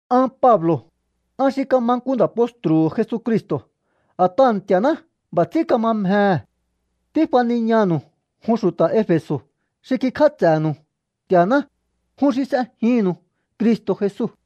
An Pablo̱, an xi kama nku nda̱ postru̱hu̱ Jesucristo̱ a̱t'aha̱ Nti̱a̱ná b'a̱ ts'ín kama mjehe̱. Tífaniñanu̱u jun xu̱ta̱ Efe̱so̱ xi kikj'áts'e̱nu̱u Nti̱a̱ná, jun xi s'ejinnu̱u Cristo̱ Jesu.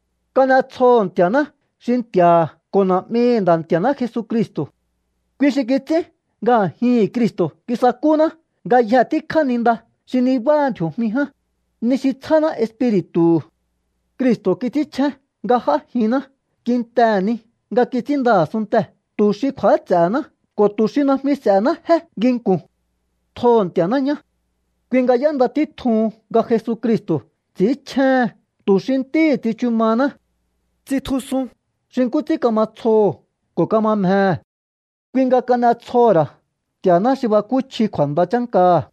Kan'etsjoho̱ Nti̱a̱ná xi Nti̱a̱ha̱ ko̱ Na̱'mihi̱ Nda̱ Nti̱a̱ná Jesucristo̱. Kui xi kits'ín nga a̱jihi̱n Cristo̱ kisakúná ngayje tíkjá ni nda xi nibáha ndji̱o̱jmi ján, ni xi tsjáná Espiri̱tu̱hu̱. Cristo̱ kits'ínchjén nga j'ájinná kintehe̱ ni nga kits'ínnda a̱sunntee̱ tu̱ xi kju̱áts'e̱he̱ná ko̱ tu̱ xi najmi s'e̱hená jé nginku̱n. Tjoho̱ Nti̱a̱ná ñá. Kui nga y'énda títjuhun nga Jesucristo̱ ts'i̱ínchjéhen tu̱ xi ntíhi̱ tsichu mahaná. Tsitjusun xi nkú ts'ín kama tsjoho̱ ko̱ kama mjehe̱. Kui nga kan'etsjoho̱ ra̱ Nti̱a̱ná xi bakúchji kju̱a̱nda chánkaha̱,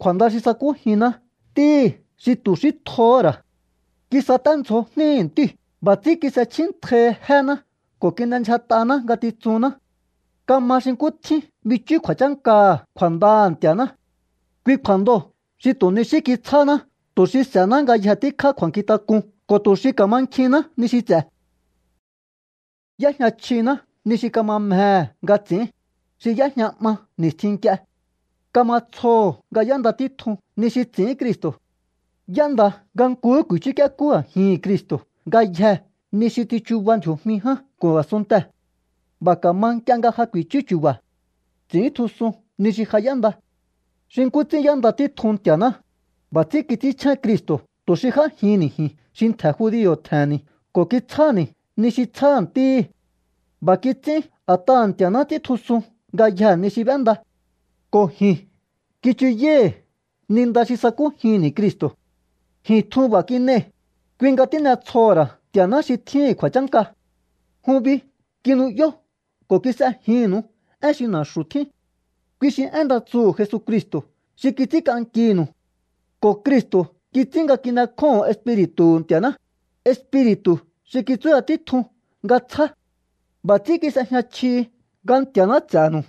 kju̱a̱nda xi sakújinná Ntíhi̱ xi tu̱ xí tjohó ra̱. Kisaténdzjo jníhi̱ Ntíu̱. B'a̱ ts'ín kis'echjíntjaihi jéná ko̱ kin'endyjat'aná ngatitsunná. Kama xi nkú tjín bichú kju̱a̱chánkaha̱ kju̱a̱ndaha̱ Nti̱a̱ná. Kui kju̱a̱ndoo̱ xi tu̱ ni xí kitsjáháná tu̱ xi s'e̱hená ngayje tíkjá kju̱a̱nkjintak'un ko̱ tu̱ xi ka̱mankjihinná ni xi ts'e̱. Y'éjña chjiná ni xi kama mjehe̱ nga ts'i̱ín, xi y'éjña 'ma ni̱stjin nk'ie. Kama tsjoho̱ nga y'énda títjun ni xi ts'i̱ín Cristo̱. Y'énda nga nkuhú ku̱i̱chúk'iekú a̱jihi̱n Cristo̱ ngayjee̱ ni xi tsichuba ndji̱o̱jmi ján ko̱ a̱sunntee̱. B'a̱ ka̱ma nk'ie nga ja ku̱i̱chú chu̱ba̱. Ts'i̱íntjusun ni xi ja y'énda. Xi nkú ts'ín y'énda títjun Nti̱a̱ná, b'a̱ ts'ín kits'ínchjén Cristo̱ tu̱ xi j'ájihi̱nni̱ ji̱n xi ntje̱ judio̱ tje̱he̱nni̱ ko̱ kitsjáni̱ ni xi tsjáha̱ ntíhi̱. B'a̱ kits'ín a̱t'aha̱ Nti̱a̱ná ts'íntjusun ngayjee̱ ni xi b'énda. Ko̱ ji̱n kichuyái̱hi̱ ni nda xi sa̱kújinni̱ Cristo̱. Ji̱n tjun b'a̱ kin'ei̱. Kui nga tín'etsjoho̱ ra̱ Nti̱a̱ná xi tjíhi̱n kju̱a̱chánka. Jun bi kinu'yó ko̱ kis'ejinnu̱u én xi na̱xu̱ tjín. Kui xi én nda tsuhu̱ Jesucristo̱ xi kits'ínk'ankinu̱u. Ko̱ Cristo̱ kits'ín nga kin'ekjóho̱on Espiri̱tu̱hu̱ Nti̱a̱ná, Espiri̱tu̱ xi kitsúya títjun nga tsjá. B'a̱ ts'ín kis'ejña chjihi nga Nti̱a̱ná ts'e̱nu̱u.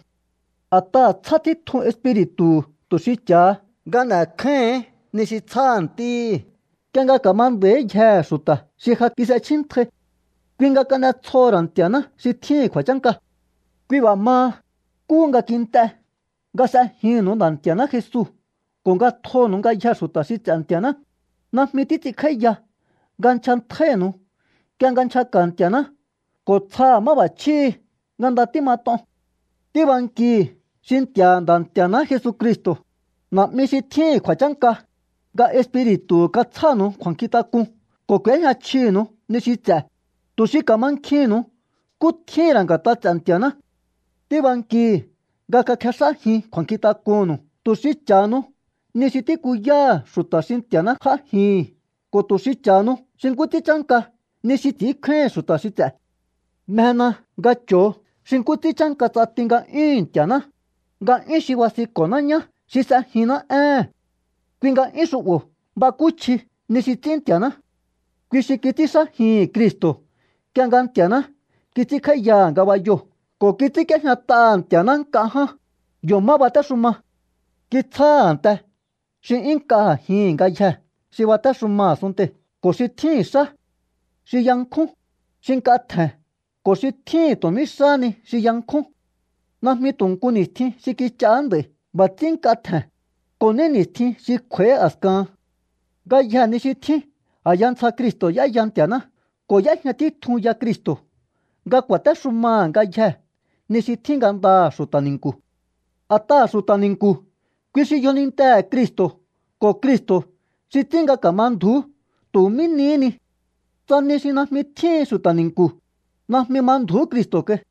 A̱t'aha̱ tsjá títjun Espiri̱tu̱hu̱ tu̱ xi cha̱ha nga n'e̱kjáíhi̱n ni xi tsjáha̱ ntíhi̱ nk'ie nga ka̱ma nda̱íyjehe̱ xu̱ta̱ xi ja kis'echjíntjai. Kui nga kan'etsjoho̱ ra̱ Nti̱a̱ná xi tjíhi̱n kju̱a̱chánka. Kui b'a̱ maha, nkúhu nga kint'e nga s'ejinnu̱u Nda̱ Nti̱a̱ná Jesu ko̱ nga tjonu̱u ngayjee̱ xu̱ta̱ xi ts'e̱ Nti̱a̱ná, najmi títs'inkj'áíya nga nchjantjáínu̱u nk'ie nga nchjaka̱ Nti̱a̱ná ko̱ tsjaha̱ máb'a̱chjíhi̱ nga nda tímat'on. Tíbankihi̱ xi Nti̱a̱ha̱ Nda̱ Nti̱a̱ná Jesucristo̱, Na̱'mi xi tjíhi̱n kju̱a̱chánka, nga Espiri̱tu̱hu̱ katsjánu̱u kju̱a̱nkjintak'un ko̱ k'u̱éjña chjinu̱u ni xi ts'e̱, tu̱ xi ka̱mankjihi̱nnu̱u nkú tjíhi̱n ra̱ nga̱t'a ts'e̱ Nti̱a̱ná. Tíbankihi̱ nga kakjex'ájin kju̱a̱nkjink'unnu̱u tu̱ xi cha̱hanu ni xi tíkuyáha̱ xu̱ta̱ xi Nti̱a̱ná j'ájihi̱n ko̱ tu̱ xi cha̱hanu xi nkú ts'ín chánka ni xi ts'i̱ínkjáíhi̱n xu̱ta̱ ts'e̱. Mjena nga cho̱o xi nkú ts'ín chánka ts'ati nga'yúhu̱n Nti̱a̱ná, nga'yún xi basinko̱ná ñá xi s'ejinná éhe̱n. Kui nga'yún xu'bo̱ bakúchji ni xi ts'ín Nti̱a̱ná. Kui xi kits'ínxájihi̱n Cristo̱ nk'ie nga Nti̱a̱ná kits'ínkj'áíyaha̱ ngabayoo̱ ko̱ kits'ínk'íéjñat'aha̱ Nti̱a̱ná nk'a ján, yo̱ má batéxuma. Kitsjáha̱ a̱nte xi 'yún nk'a a̱jihi̱n ngayjee̱ xi batéxuma a̱sunntei̱ ko̱ xi tjíhi̱n xá, xi yankjún, xi nk'a tje̱n ko̱ xi tjíhi̱n tu̱ mí xáhá ni xi yankjún. Najmi tu̱ nku ni̱stjin xi kich'aá nd'a̱i̱ b'a̱ ts'ín nk'a tje̱n, ko̱ ní ni̱stjin xi kj'u̱a̱í a̱skahan. Ngayjee̱ ni xi tjín a̱ya ntsja Cristo̱ y'éya Nti̱a̱ná ko̱ y'éjña títjun ya Cristo̱ nga ku̱a̱téxumaha̱ ngayjee̱ ni xi tjín ngandaha̱ xu̱ta̱ ni̱nku̱. A̱t'aha̱ xu̱ta̱ ni̱nku̱, kui xi yjonintehe̱ Cristo̱ ko̱ Cristo̱ xi ts'ín nga ka̱ma ndju̱ú tu̱ mí nihí ni. Tsa ni xi najmi tjíhin xu̱ta̱ ni̱nku̱, najmi ma ndju̱ú Cristo̱ kai.